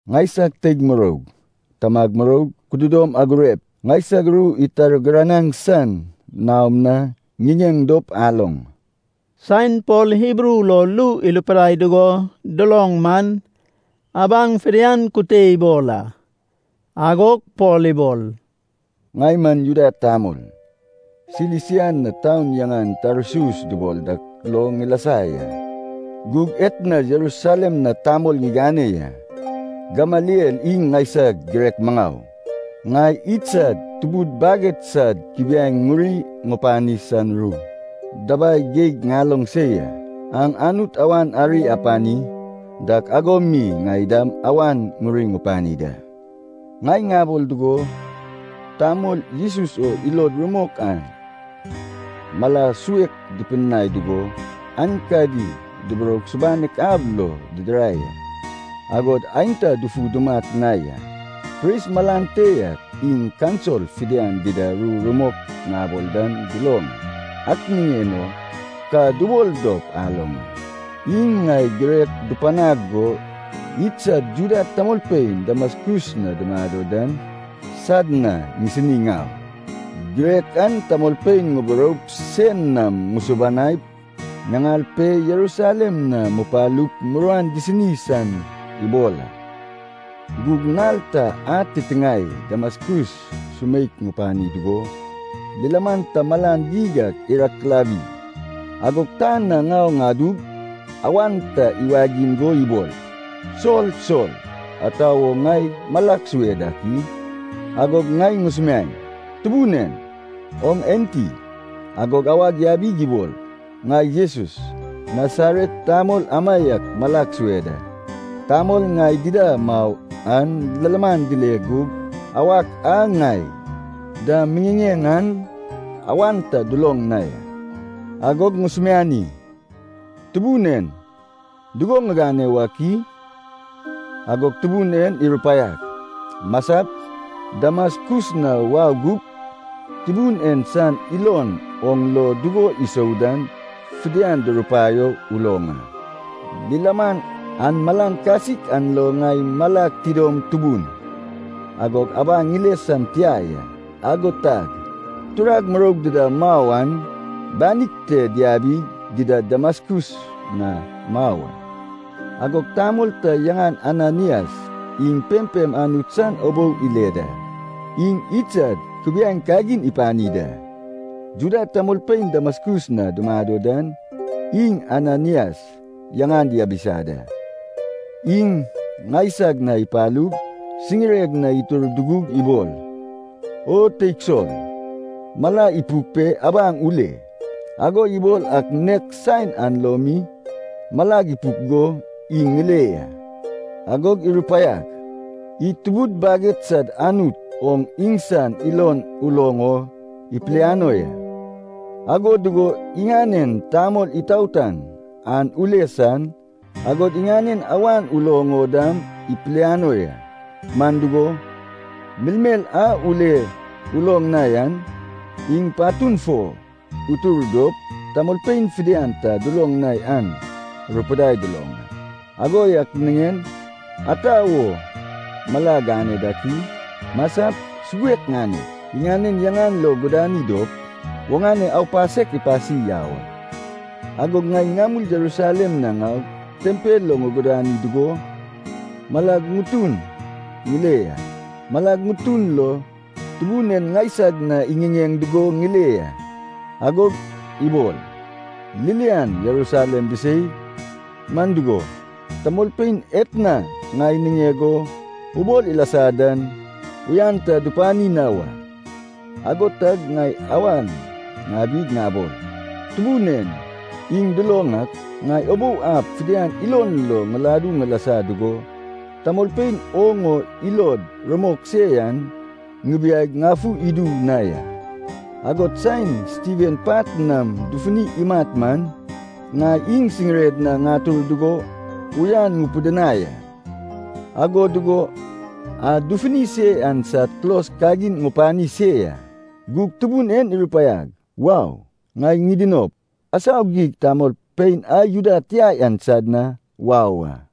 “Ŋaisag teig muroug, tamag muroug, kududom agurep, ŋaisag ru itargiranag san naom na ŋiŋeŋ dop aloŋ.” Saen Pol Hibru lo ru irupidai dugo duloŋ man, abaŋ fidian kute ibol a. Agog Pol ibol, “Ŋai man Juda tamol, Silisia na taun yaŋan Tarsus dubol dak lo ŋilasa ya. Gug etna Jerusalem na tamol ŋigane ya. Gamaliel iŋ ŋaisag girek maŋau. Ŋai idsad tubud baged sad kubiaeŋ ŋuri ŋupani san ru dabai geig ŋaloŋ se ya. Aŋ Anut awan ari apani dak ago mi ŋai dam awan ŋuri ŋupani da. Ŋai ŋabol dugo, tamol Jesus o ilod rumok an mala suek ŋupidinai dugo, aenkadi duburoug subanek ab lo didirai a. Agod aenta dufu dumat na ya. Pris malan te yak, iŋ kaunsil fidian dida ru rumok ŋabol dan duloŋ a. Ak niŋen o ka dubol dop aloŋ a. Iŋ ŋai girek dupanag go idsad Juda tamolpein Damaskus na dumado dan sad na ŋisini ŋau. Girek an tamolpein ŋuburoup sein nam dusubanaip, ŋaŋal pe, Jerusalem na mupalup muruan disini san ibol a.” “Gug nal ta ad titiŋae Damaskus sumeik ŋupani dugo, lilaman ta malan geig ak irakilawi. Agog tan na ŋau ŋadug, awan ta iwagiŋ go ibol, ‘Sol, Sol! Ata wo ŋai malag sue dak i?’ “Agog ŋai ŋusumiaeŋ, ‘Tubun en, oŋ enti?’” “Agog awag yabig ibol, ‘Ŋai Jesus, Nasaret tamol amaiak malag sue da.’ Tamol ŋai dida mau an lilaman dile gug awak a ŋai da miŋiŋeŋ an awan ta duloŋ na ya.” “Agog ŋusumiani, ‘Tubun en, dugo ŋigane wak i?’” “Agog Tubun en irupaiag, ‘Masap, Damaskus na wau gup, Tubun en san ilon oŋ lo dugo isou dan fidian durupaio uloŋ a.’ Lilaman an malan kasik an lo ŋai malag tidom tubun, agog abaŋ ŋile san tia ya. Ago tag turag muroug dida mau an banig te diabig dida Damaskus na mau a.” “Agog tamol ta yaŋan Ananaias, iŋ pempem Anut san ubou ile da. Iŋ idsad kubiaeŋ kagin ipani da. Juda tamolpein Damaskus na dumado dan iŋ Ananaias yaŋan diabisa da. Iŋ ŋaisag na ipalug, siŋireg na itur dugug ibol, ‘O teig Sol, mala ipuk pe abaŋ ule.’ Ago ibol ak nek saen an lo mi malag ipuk go iŋ ŋile ya. Agog irupaiag, ‘Id tubud baged sad Anut oŋ iŋsan ilon uloŋ o ipiliano ya. Ago dugo iŋanen Tamol Itaotan an ule san, agod iŋanen awan uloŋ o dam ipiliano ya. Man dugo, melmel a ule uloŋ na yan, iŋ patun fo utur dop tamolpein fidian ta duloŋ na yan rupidai duloŋ a. Ago yak niŋen ata wo mala gane dak i? Masap, suguek ŋanep, iŋanen yaŋan lo gudani dop, oŋane aupasek ipasi yau a.’” “Agog ŋai ŋamul Jerusalem na ŋaug, tempel lo ŋugudani dugo, malag ŋutun ŋile ya. Malag ŋutun lo Tubun en ŋaisag na iŋiŋeŋ dugo ŋile ya. Agog ibol, ‘Ririan Jerusalem bisei. Man dugo, tamolpein etna ŋai niŋeg o ubol ilasa dan uyan ta dupani na wa.’” “Ago tag ŋai awan ŋabig ŋabol, ‘Tubun en, iŋ duloŋ ak, ŋai ubou ab fidian ilon lo ŋiladu ŋilasa dugo, tamolpein oŋ o ilod rumok se yan ŋibiaig ŋafu idu na ya. Agod saen Stiven pat nam dufuni imat man, ŋai iŋ siŋired na ŋatur dugo uyan ŋupidinai a, ago dugo a dufuni se yan sad kulos kagin ŋupani se ya.’ Gug Tubun en irupaiag, ‘Wau. Ŋai ŋidinop, asau geig tamolpein a Juda tia yan sad na wau a.’”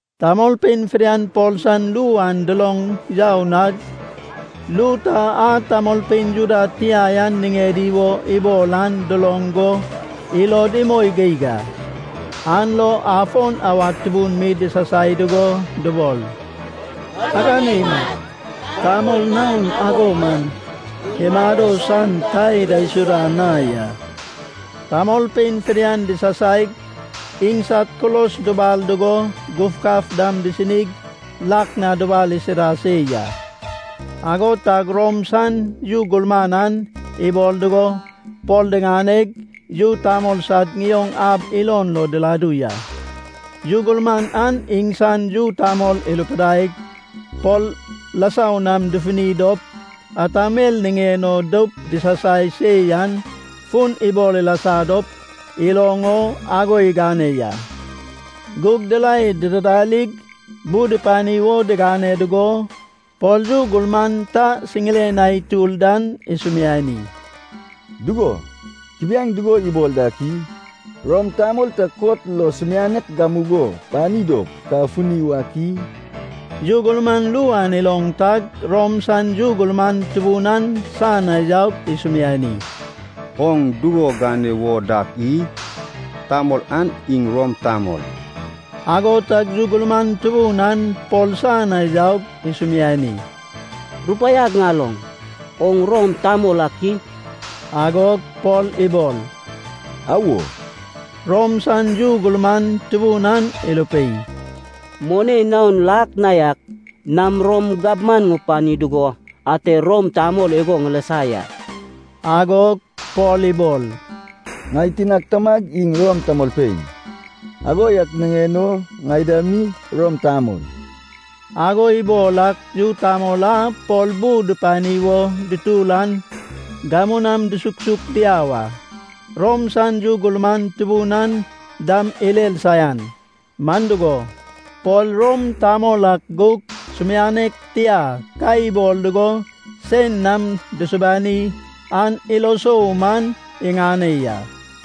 Tamolpein fidian Pol san ru an duloŋ yau nag, ru ta a tamolpein Juda tia yan niŋedi wo ibol an duloŋ go ilod imoi geig a. An lo afon awad tubun mi disasai dugo dubol, “Agane imat. Tamol naon ago man imado san ta idaisuda na ya.” Tamolpein fidian disasaig, iŋsad kulos dubal dugo gufgaf dam disinig lak na dubal isida se ya. Ago tag Rom san yu gurman an ibol dugo Pol diŋaneg, yu tamol sad ŋioŋ ab ilon lo diladu ya. Yu gurman an iŋsan yu tamol irupidaig, Pol rasau nam dufuni dop ata mel niŋen o doup disasai se yan fun ibol ilasa dop iloŋ o ago igane ya. Gug dirae didarig bu dupani wo digane dugo, Pol yu gurman ta siŋiren na itur dan isumiani, “Dugo, kubiaeŋ dugo ibol dak i? Rom tamol ta kot lo sumianek gamugo pani dop ka funi wak i?” Yu gurman ru an iloŋ tag Rom san yu gurman tubun an san na yaug isumiani, “Oŋ dugo gane wo dak i? Tamol an iŋ Rom tamol.” Ago tag yu gurman tubun an Pol san na yaug isumiani, “Rupaiag ŋaloŋ. Oŋ Rom tamol ak i?” Agog Pol ibol, “Awo.” Rom san yu gurman tubun an irupei, “Moni naon lak na yak nam Rom gabman ŋupani dugo ate Rom tamol igo ŋilasa ya.” Agog Pol ibol, “Ŋai tinag tamag iŋ Rom tamolpein, ago yak niŋen o ŋai dam mi Rom tamol.” Ago ibol ak yu tamol a Pol bu dupani wo dutur an gamu nam dusuksuk diau a. Rom san yu gurman tubun an dam irer saian. Man dugo, Pol Rom tamol ak gug sumianek tia ka ibol dugo sein nam dusubani an ilo sou man iŋane ya.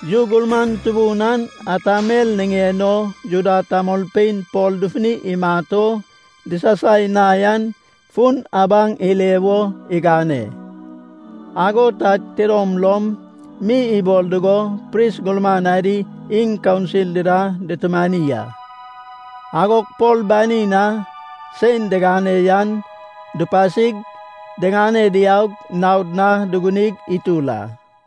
Yu gurman tubun an ata mel niŋen o Juda tamolpein Pol dufuni imat o disasai na yan fun abaŋ ile wo igane. Ago tag tidom lom mi ibol dugo pris gurman adi iŋ kaunsil dida dutumani a. Agog Pol banin na sein digane yan dupasig, diŋane diaug naod na dugunig itur a.